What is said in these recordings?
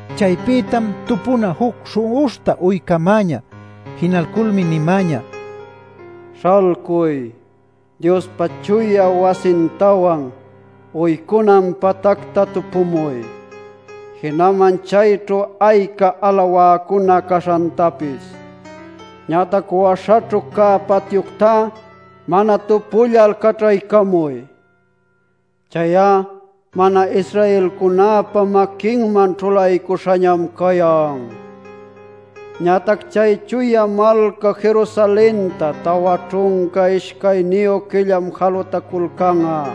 Chaypïtam tupuna juc śhu'uśhta uycämäñä. Jinalculmi nimäñä: “Śhalcuy, Diospa chuya wasintawan uycunan patacta tupumuy, jinaman chayćhu ayca alawäcuna caśhantapis. Ñatac waśhaćhu cä patyuctá mana tupullal caćhaycamuy. Chay'a mana-Israelcunäpa maquinman ćhulaycuśhañam cayan. Ñatac chay Chuya Malca Jerusalenta tawa ćhunca ishcayniyu quillam jalutaculcan'a.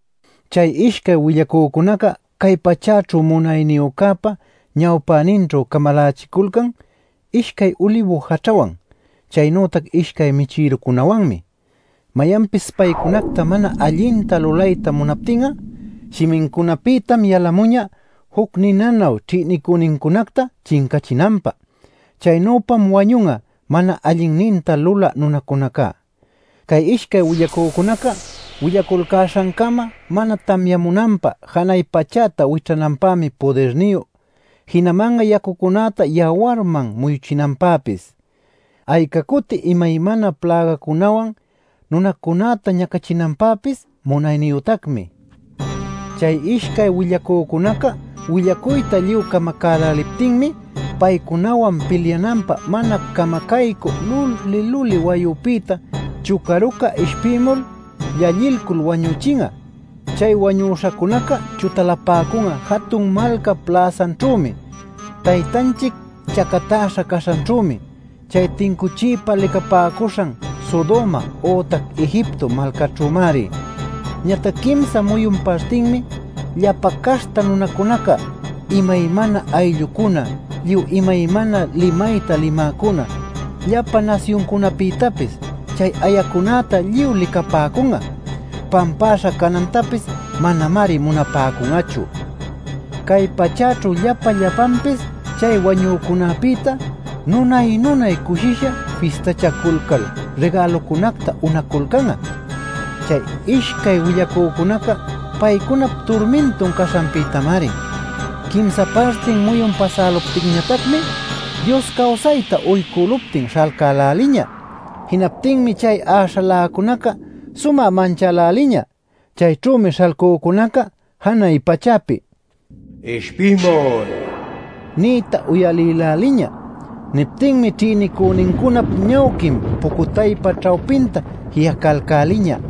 Chay ishcay willacücunaca cay pachäćhu munayniyücäpa ñawpäninćhu camalachiculcan ishcay ulibu jaćhawan chaynütac ishcay michïrucunäwanmi. Mayanpis paycunacta mana allinta lulayta munaptin'a, shimincunapïtam yalamuñä juc ninanuy ćhïnicünincunacta chincachinanpä. Chaynüpam wañun'a mana allinninta lulä munäcunaca. Cay ishcay willacücunaca willaculcäśhancama mana tamyamunanpä janay pachäta wićhananpämi pudirniyu. Jinaman'a yacucunäta yawarman muyuchinanpäpis, ayca cuti imaymana plägacunawan nunacunäta ñacachinanpäpis munayniyütacmi. Chay ishcay willacücunaca willacuyta lluy camacäläliptinmi paycunawan pilyananpä mana camacaycü luli-luli wayupïta “Chucaruca” ishpïmul llallilcul wañüchin'a. Chay wañüśhacunaca chutalapäcun'a jatun malcap läsanćhümi, Taytanchic chacatäśha caśhanćhümi, chay tincuchiypa licapäcuśhan “Sodoma” ütac “Egipto” malcaćhümari. Ñatac quimsa muyun partinmi llapa caśhta nunacunaca, imaymana ayllucuna, lluy imaymana limayta limäcuna, llapa nasyuncunapïtapis, chay ayacunäta lluy licapapäcun'a. Pampaśha canantapis manamari munapäcun'achu. Cay pachäćhu llapa llapanpis chay wañücunapïta nunay-nunay cushisha fistachaculcal rigälucunacta unaculcan'a, chay ishcay willacücunaca paycunap turmintun caśhanpïtamari. Quimsa partin muyun pasäluptinñatacmi Dios cawsayta uycüluptin śhalcäläliñä. Jinaptinmi chay äśhaläcunaca sumä manchäläliñä. Chayćhümi śhalcücunaca janay pachäpi “¡Ishpimuy!” nïta uyalïläliñä. Niptinmi ćhïnicünincunap ñawquin pucutaypa ćhawpinta ji'acalcäliñä.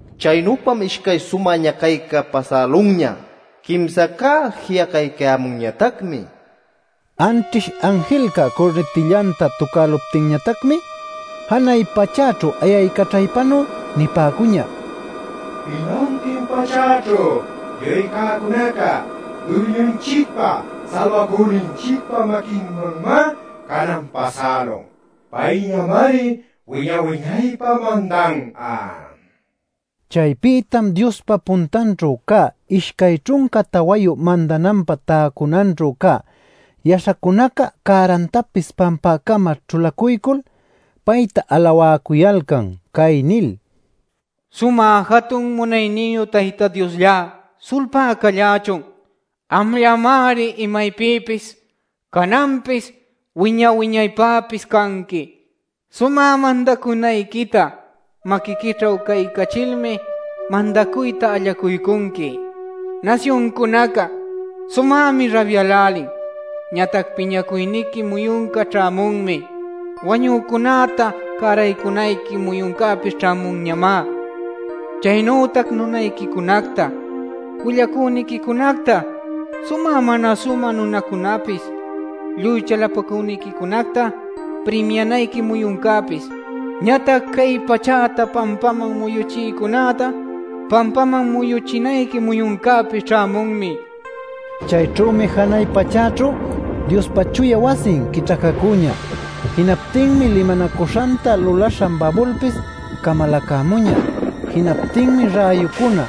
Chaynüpam ishcay sumä ñacayca pasälunña; quimsacá ji'acaycayämunñatacmi. Anćhish anjilca curnitillanta tucäluptinñatacmi janay pachäćhu ayaycaćhaypanuy nipäcuñä: “Jinantin pachäćhu lluy cäcunaca Duyñunchicpa, Salbacüninchicpa maquinmanñamá canan pasälun; payñamari wiña-wiñaypä mandan'a” nil. Chaypïtam Diospa puntanćhu cä ishcay ćhunca tawayu mandananpä täcunanćhu cä yaśhacunaca cärantapis pampäcama ćhulacuycul payta alawäcuyalcan cay nil: “Sumä jatun munayniyu Tayta Diosllá, sulpá callächun. Amllamari imaypïpis, cananpis, wiña-wiñaypäpis canqui. Sumä mandacunayquita maquiquićhu caycachilmi mandacuyta allacuycunqui. Nasyuncunaca sumämi rabyälälin; ñatac piñacuyniqui muyunca ćhämunmi. Wañücunäta cäraycunayqui muyuncäpis ćhämunñamá. Chaynütac nunayquicunacta, willacüniquicunacta, sumä mana sumä nunacunapis, lluy chalapacüniquicunacta primianayqui muyuncäpis, ñatac cay pachäta pampaman muyuchïcunäta pampaman muyuchinayqui muyuncäpis ćhämunmi” nil. Chayćhümi janay pachäćhu Diospa chuya wasin quićhacacüñä. Jinaptinmi limanacuśhanta lulaśhan babulpis camalacämuñä. Jinaptinmi räyucuna,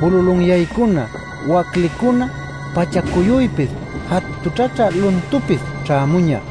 bululunyaycuna, waclicuna, pacha-cuyuypis, jatućhaćhä luntupis ćhämuñä.